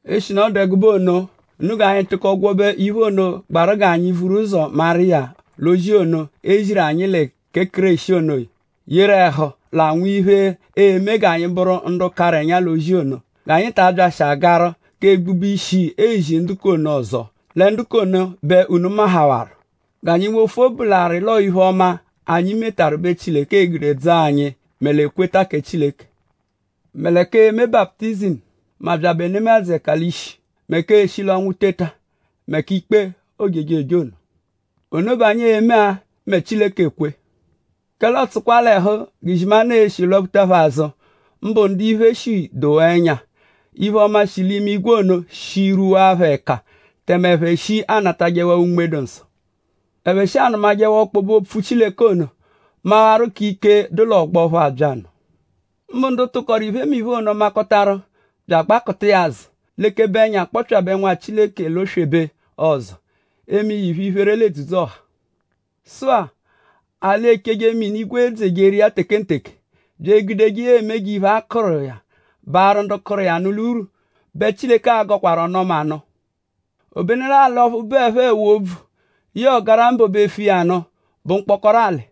Eshinu ọ dụ ẹgube ono; unu g'anyi tụko gwọbe iphe ono, gbaru g'anyi vuru ụzo maru iya l'ozi ono, e ziru anyi lẹ kẹ Kéreshi ono; yeru ẹhu l'anwụ iphe, e-me g'anyi bụru ndu karụ ẹnya l'ozi ono. G'anyi ta abyashị agarụ k'egbube ishi ezi ndu k'ono ọzo; lẹ ndu k'ono bẹ unu mahawarụ. G'anyi wofu obu l'arị l'ọo iphe-ọma, anyi metaru bẹ Chileke e-gude dzọo anyi, mẹ l'ekweta kẹ Chileke; mẹ lẹ k'eme baputizimu; mẹ abyabẹ nemadzụ ẹka l'ishi; mẹ k'eshi l'ọnwu teta; mẹ k'ikpe ojejoje ono. Ono bẹ anyi e-me-a mẹ Chileke -kwe. Kẹle ọotsukwa l'ẹhu g'izimanụ e-shi lwaphuta phẹ azụ; mbụ ndu iphe, shi dowaa ẹnya; iphe-ọma, shi l'imigwe ono shi rwuwaa phẹ ẹka; tẹme ẹphe shi anatajẹwaa Unme-dụ-Nsọ; ẹphe shi anụmajewaa ọkpobe-Opfu Chileke ono; mawaru k'ike, dụ l'ọgbo ọphu abyanụ; mbụ ndu tụkoru iphemiphe ono, makọtaru bya agbakụta iya azụ; lekebe ẹnya akpọpyabe Nwa Chileke l'oswebe ọzo; eme iya iphe-iphere l'edzudzu-ọha. Sụ-a; l'alị, echeje mini, igwe edzejeru iya tekenteke; bya egudeje iya eme g'iphe, a kụru iya baarụ ndu kụru iya nụ l'urwu bẹ Chileke a-gọkwaru ọnu-ọma nụ. Obenu l'alị ọphu bụepho ẹwu-óbvú yẹe ọgarambo bẹ efu iya nụ bụ mkpọkoro alị.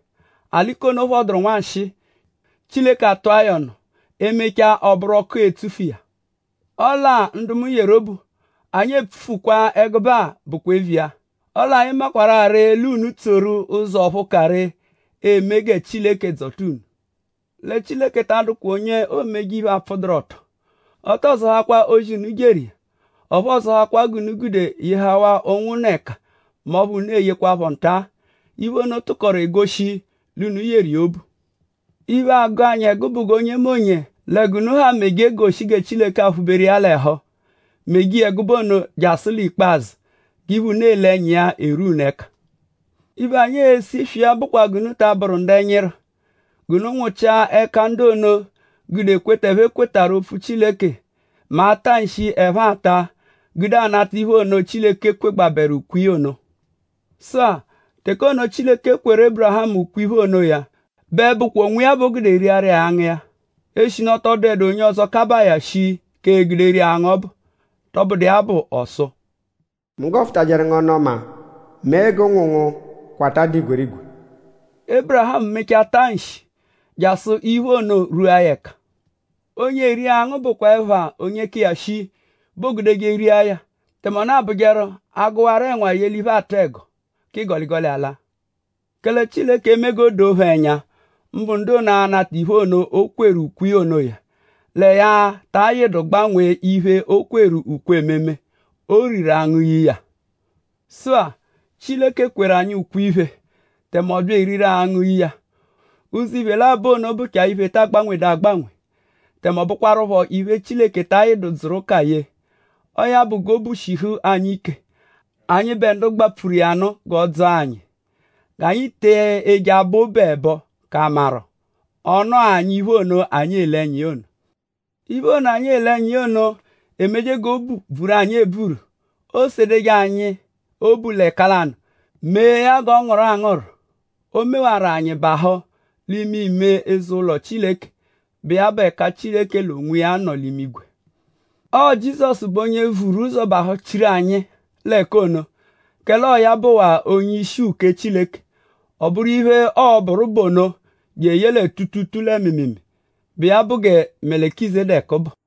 Alị k'ono phọduru nwanshịi; Chileke atụa ya ọnu. Ee-mechaa; ọoburu ọku, e-tsufu iya. Ọle-a; ndu mu yeru obu; anyi epfukwaa ẹgube-a bụkwa eviya; ọle anyi makwarụ-a ree l'unu e-tsoru-a ụzo ọphu ka ree, e-me gẹ Chileke dzọta unu. Lẹ Chileke ta adụkwa onye oomeje iphe, apfụduru-ọto. Ọ tọo zọhakwa ozi, unu jeru; ọphu ọo-zọhakwa g'unu gude yehawaru ụnwunna ẹka mẹ ọphu unu eyekwaphọ nta. Iphe ono tụkoru egoshi l'unu yeru iya obu. Iphe, agụ anyi bụ g'onyemonye lẹ g'unu ha meje goshi gẹ kẹ Chileke aphụ-beru iya l'ẹhu; meje iya ẹgube ono jasụ l'ikpazụ g'iphe, unu ele ẹnya iya erwua unu ẹka. Iphe, anyi ese iswi iya bụkwa g'unu ta abụru ndu ẹnyiru. G'unu nwụchia ẹka ndu ono, gude ekweta, ẹphe kwetarụ opfu Chileke mẹ ata nshi, ẹphe ata gude anata iphe ono, Chileke kwegbaaru ukwe iya ono. Sụ-a; teke ono, Chileke kweru Ébirihamu ukwe-iphe onoya bẹ bụkwa onwiya bẹ o gude riaru iya angụ iya; eshinu ọ tọ dụedu onye ọzo, kabaa ya shii k'egude ria angụ ọbu. Tọbudu iya bụ; ọ sụ: “Mu gọfutajeru ngu ọnu-ọma; mee g'ụnwu ngu kwata dụ igwerigwe.” Ébirihamu mechaa taa nshi; jasụ iphe-ọma ono, rwu iya ẹka. Onye eri angụ bụ ẹpha onye ka iya shii bẹ oogudeje ria ya; tẹme ọ nọdu abụjeru: a -gụwaru ẹnwa ye l'iphe, aatụ ẹgo; k'igọligoli alaa. Kẹle Chileke eme g'o doo phẹ ẹnya; mbụ ndu ono, a-nata iphe ono, o kweru ukwe iya onoya; lẹ ya ta ayịdu gbanwee iphe, ya kweru ukwe ememe; o riru angụ ye iya. Sụ-a; Chileke kweru anyi ukwe-iphe; tẹme ọ bya eriru angụ ye iya. Ụzo iphe labọ ono bụchaa iphe, ta agbanwedu agbanwe; tẹme ọ bụkwarupho iphe, Chileke ta ayịdu dzụru ụka ye. Ọo ya bụ g'obu eshihu anyi ike; anyịbe ndu gbapfuru iya nụ g'ọ dzọo anyi; g'anyi te eje abọ obu ẹbo k'a maru:?ọo-nụa anyi iphe ono, anyi ele ẹnya iya ono. Iphe ono, anyi ele ẹnya iya ono emeje g'obu bvuru anyi ebvuru. Oosedeje anyi obu l'ẹka lanụ mee ya g'ọ ngụru angụru. O mewaru anyi bahụ l'ime ime eze-ụlo Chileke, bụ iya bụ ẹka Chileke l'onwiya nọ l'imigwe. Ọo Jizọsu bụ onye vuru ụzo bahụchiru anyi l'ẹka ono; kẹle ọo ya bụwaa onye-ishi uke Chileke. Ọ bụru iphe, ọo-bụru bụ ono jeye lẹ tuutuutuu lẹ mịimiimii, bụ iya bụ gẹ Melikizedeku bụ.